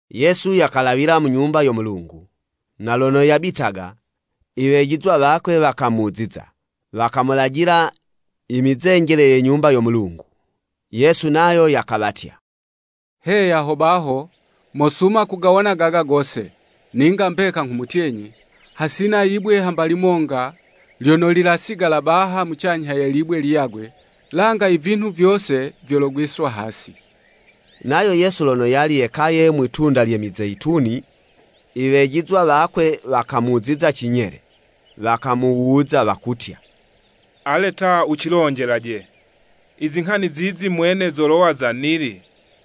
Yesu yakalawila mu Nyumba yo Mulungu, na lono yabitaga, iwejizwa wakwe wakamuziza, wakamulajila imizenjele ye Nyumba yo Mulungu. Yesu nayo yakawatya, “Heya ho baho, mosuma kugawona gaga gose! Ninga mbeka nghumutyenyi, hasina yibwe hamba limonga lyono lilasigala baha, mucanyha ye libwe liyagwe, langa i vinhu vyose vyologwiswa hasi.” Nayo Yesu lono yali yekaye mwi'tunda lye Mizeyituni, i wejizwa wakwe wakamuziza cinyele, wakamuwuza wakutya, “Ale ta, wucilonjelaje, i zinghani zizi mwene zolowa za nili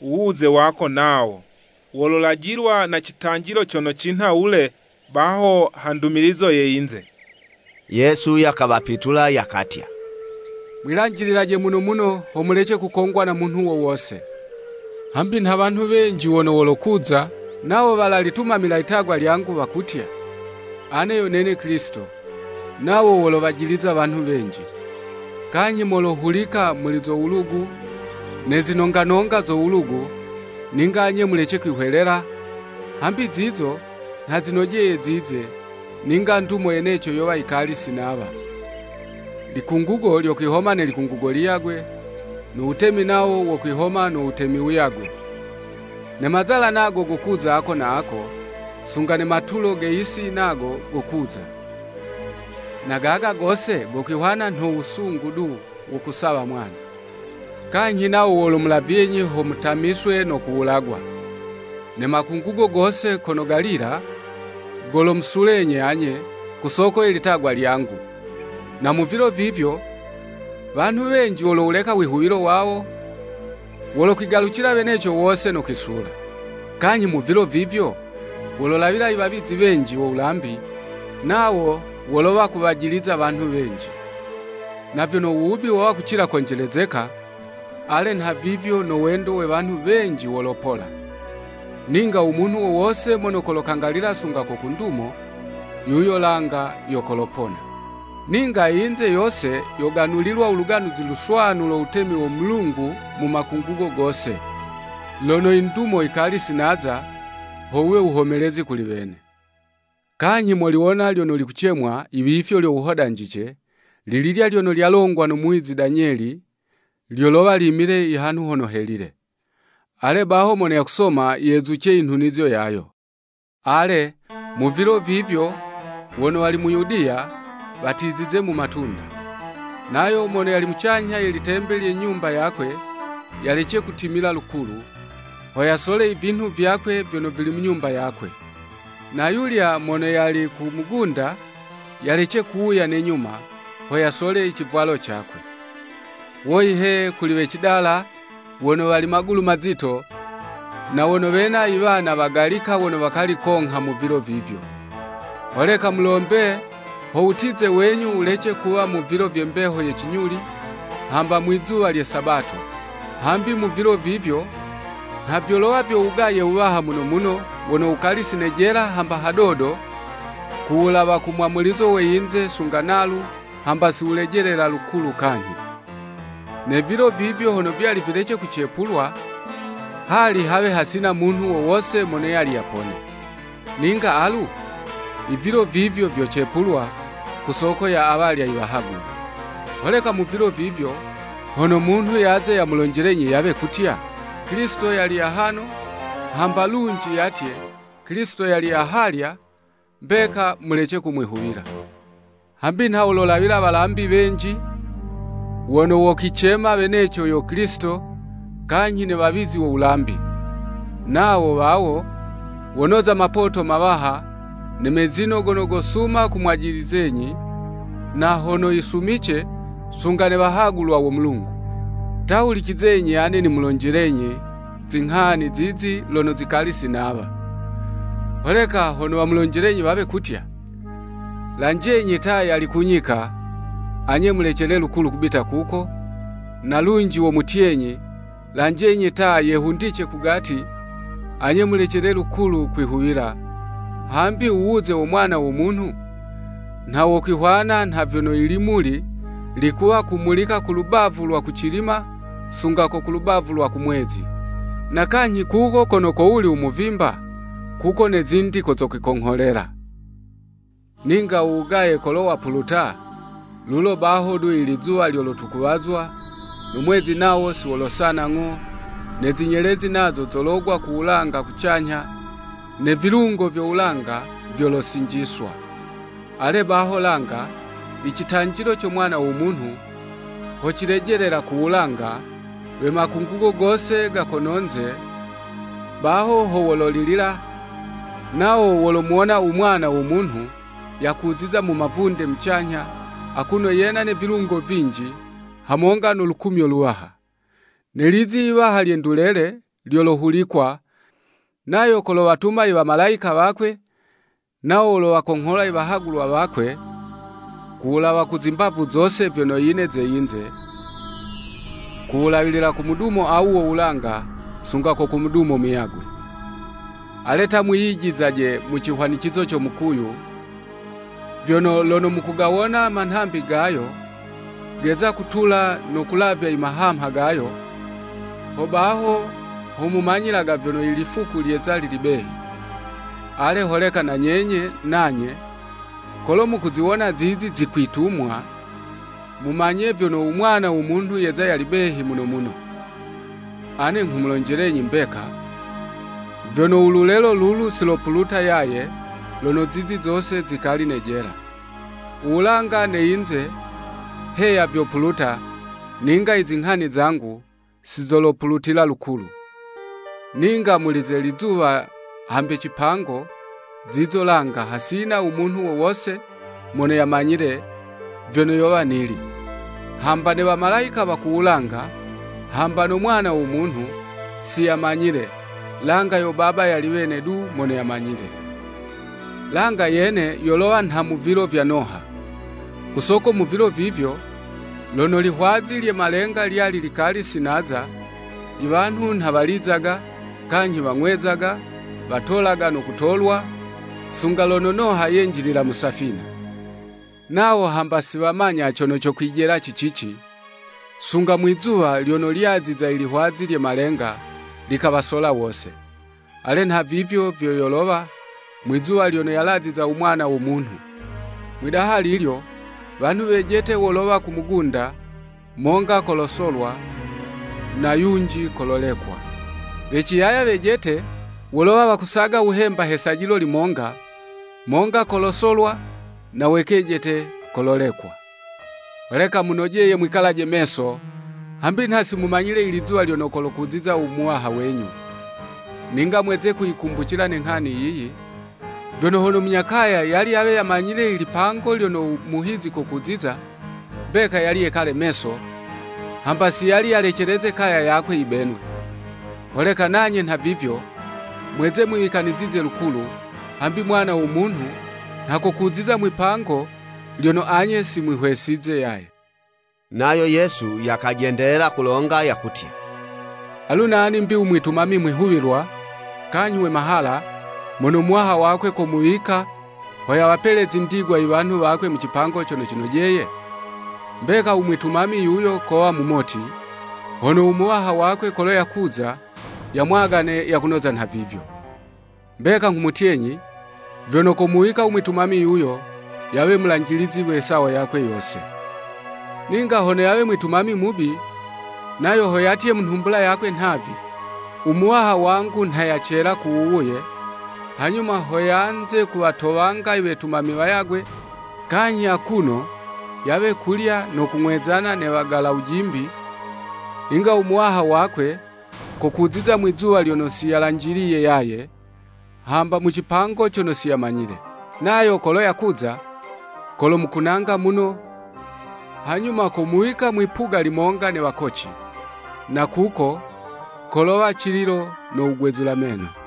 uwuze wako nawo, wololajilwa na citanjilo cono cinha wule baho ha ndumilizo ye yinze.” Yesu yakawapitula yakatya, “Mwilanjililaje muno muno, ho mulece kukongwa na munhu wo wose. Hambi nha wanhu wenji wono wolokuza, nawo walalitumamila litagwa lyangu wakutya, ‘Ane yo nene Kilisito, nawo wolowajiliza wanhu wenji.’ Kanyhi molohulika muli zo wulugu, ne zinonga nonga zo wulugu, ninga anye mulece kwihwelela, hambi zizo, nha zinojeye zize, ninga ndumo yeneco yowa yikali si nawa. Likungugo lyokwihoma ne likungugo liyagwe, no wutemi nawo wokwihoma no wutemi wuyagwe. Ne mazala nago gokuza ako na ako, sunga ne matulo ge yisi nago gokuza. Na gaga gose gokwihwana nho wusungu du, wo kusawa mwana. “Kanyhi nawo wolomulavyenyi ho mutamiswe no kuwulagwa. Ne makungugo gose kono galila, golomusulenyi anye, ku soko ye litagwa lyangu. Na mu vilo vivyo, wanhu wenji wolowuleka u wihuwilo wawo, wolokwigalucila weneco wose no kwisula. Kanyhi mu vilo vivyo, wololawila iwawizi wenji wo wulambi, nawo wolowa kuwajiliza wanhu wenji. Na vyono u wubi wowa kucila konjelezeka, ale nhavivyo no wendo we wanhu wenji wolopola. Ninga u munhu wo wose mono kolokangalila sunga ko ku ndumo, yuyo langa yo kolopona. Ninga i yinze yose, yoganulilwa u Luganuzi Luswanu lo Wutemi wo Mulungu mu makungugo gose, lono i ndumo yikali si naza, ho wuwe wuhomelezi kuli wene.” “Kanyhi moliwona, ‘lyono likucemwa.’ Iwifyo lyo wuhodanje, lililya lyono lyalongwa no muwizi Danyeli, lyolowa limile i hanhu hono helile.” (Ale baho, mono yakusoma, yezuce i nhunizo yayo.) “Ale, mu vilo vivyo wono wali mu Yudiya, watizize mu matunda. Nayo mono yali mucanyha ye litembe lye nyumba yakwe, yalece kutimila lukulu, ho yasole ivinhu vyakwe, vyono vili mu nyumba yakwe. Na yulya mono yali ku mugunda yalece kuwuya ne nyuma, ho yasole icivwalo cakwe. Woyi he, kuli we cidala wono wali magulu mazito, na wono wena iwana wagalika wono wakali kongha mu vilo vivyo. Holeka mulombe ho wutize wenyu wulece kuwa mu vilo vye mbeho ye cinyuli, hamba mwizuwa lye Sabato! Hambi mu vilo vivyo nha vyolowa vyo wugaye wuwaha muno muno, wono wukali si nejela hamba hadodo kuwulawa ku mwamulizo we yinze sunga nalu, hamba si wulejelela lukulu kanyhi. Ne vilo vivyo hono vyali vilece kucepulwa, hali hawe hasina munhu wo wose mono yali yapone, ninga alu, ivilo vivyo vyocepulwa, ku soko ya awalya iwahagulwa. “Holeka mu vilo vivyo, hono munhu yaze yamulonjelenyi yawe kutya, ‘Kilisito yali ahano,’ hamba lunji yatye, ‘Kilisito yali ahalya,’ mbeka mulece kumwihuwila. Hambi nha wololawila walambi wenji, wono wokwicema weneco yo Kilisito, kanyhi ne wawizi wo wulambi. Nawo wawo wonoza mapoto mawaha, ne mezino gono gosuma kumwajilizenyi, na hono yisumice sunga ne wahagulwa wo Mulungu. Ta hulicizenyi, ane nimulonjelenyi zinghani zizi lono zikali si nawa. Holeka hono wamulonjelenyi wawe kutya, ‘Lanjenyi ta yali ku nyika,’ anye mulecele lukulu kubita kuko, na lunji womutyenyi, ‘Lanjenyi ta, yehundice kugati,’ anye mulecele lukulu kwihuwila, hambi u wuze wo Mwana wo Munhu, nha wokwihwana nha vyono i limuli likuwa kumulika ku lubavu lwa kucilima sunga ko ku lubavu lwa kumwezi. Na kanyhi kuko kono kowuli u muvimba, kuko ne zindi ko zokwikongholela.” “Ninga u wugaye kolo wapuluta, lulo baho du ilizuwa lyolotukuwazwa, no mwezi nawo si wolosana ng'o, ne zinyelezi nazo zologwa ku wulawa kucanyha, ne vilungo vyo wulanga, vyolosinjiswa. Ale baho langa, icitanjilo co Mwana wo Munhu, ho cilejelela ku wulanga, we makungugo gose ga kono'nze baho ho wololilila, nawo wolomuwona u Mwana wo Munhu, yakuziza mu mavunde mucanyha, akuno yena ne vilungo vinji hamonga no lukumyo luwaha. Ne lizi yiwaha lye ndulele, lyolohulikwa, nayo kolowatuma i wamalayika wakwe, nawo wolowakonghola i wahagulwa wakwe ku wulawa ku zimbavu zose vyono yine ze yinze, kuwulawilila ku mudumo awu wo wulanga, sunga ko ku mudumo muyagwe.” “Ale ta, mwiyijizizaje mu cihwanicizo co mukuyu, vyono, lono mukugawona manhambi gayo geza kutula no kulavya i mahamha gayo, ho baho ho mumanyilaga vyono i lifuku lyeza lili behi. Ale, holeka na nyenye nanye, kolo mukuziwona zizi zikwitumwa, mumanye vyono u Mwana wo Munhu yeza yali behi muno muno. Ane nghumulonjelenyi mbeka, vyono u lulelo lulu si lopuluta yaye, lono zizi zose zikali nejela. U wulanga ne yinze, heya vyopuluta, ninga i zinghani zangu, si zolopulutila lukulu.” “Ninga muli ze lizuwa hambe cipango, zizo langa, hasina u munhu wo wose mono yamanyile vyono yowa nili, hamba ne wamalayika wa ku wulanga, hamba no Mwana wo Munhu, siyamanyile, langa yo Baba yali wene du mono yamanyile. Langa yene, yolowa nha mu vilo vya Noha. Ku soko mu vilo vivyo, lono lihwazi lye malenga lyali likali si naza iwanhu nha walizaga, kanyhi wang'wezaga, watolaga no kutolwa, sunga lono Noha yenjilila mu safina. Nawo hamba si wamanya cono cokwijela ci cici, sunga mwizuwa lyono lyaziza ilihwazi lye malenga, likawasola wose. Ale, nhavivyo vyo yolowa, mwizuwa lyono yalaziza u Mwana wo Munhu. Mwidaha lilyo, wanhu wejete wolowa ku mugunda, monga kolosolwa, na yunji kololekwa. We ciyaya wejete wolowa wakusaga wuhemba he sajilo limonga, monga kolosolwa, na we kejete, kololekwa. Holeka munojeye mwikalaje meso, hambi nha simumanyile ilizuwa lyono kokuziza u Muwaha wenyu. Ninga mweze kuyikumbucila ne nghani yiyi, vyono hono munya kaya, yali yawe yamanyile ilipango lyono u muhizi kokuziza, mbeka yali yekale meso, hamba si yali yayileceleze kaya yakwe yibenwe. Holeka nanye nhavivyo, mweze mwiwikanizize lukulu, hambi Mwana wo Munhu nha kokuziza mwi'pango lyono anye si mwihwesize yaye.” Nayo Yesu, yakajendelela kulonga yakutya, “Alu nani 'mbi u mwitumami mwihuwilwa, kanyhi we mahala, mono muwaha wakwe komuwika, ho yawapele zindigwa iwanhu wakwe mucipango cono cinojeye? Mbeka u mwitumami yuyo kowa mumoti, hono u muwaha wakwe kolo yakuza, yamwagane yakunoza nhavivyo. Mbeka nghumutyenyi, vyono komuwika u mwitumami yuyo, yawe mulanjilizi we sawo yakwe yose. Ninga hono yawe mwitumami mubi, nayo ho yatye mu nhumbula yakwe nhavi, ‘U Muwaha wangu nha yacela ku wuwuye,’ hanyuma ho yanze kuwatowanga i wetumami wayagwe kanyhi akuno yawe kulya no kung'wezana ne wagala wujimbi, ninga u muwaha wakwe, kokuziza mwizuwa lyono siyalanjiliye yaye, hamba mu cipango cono si yamanyile. Nayo kolo yakuza, kolomukunanga muno, hanyuma komuwika mwi'puga limonga ne wakoci. Na kuko kolowa cililo no wugwezula meno.”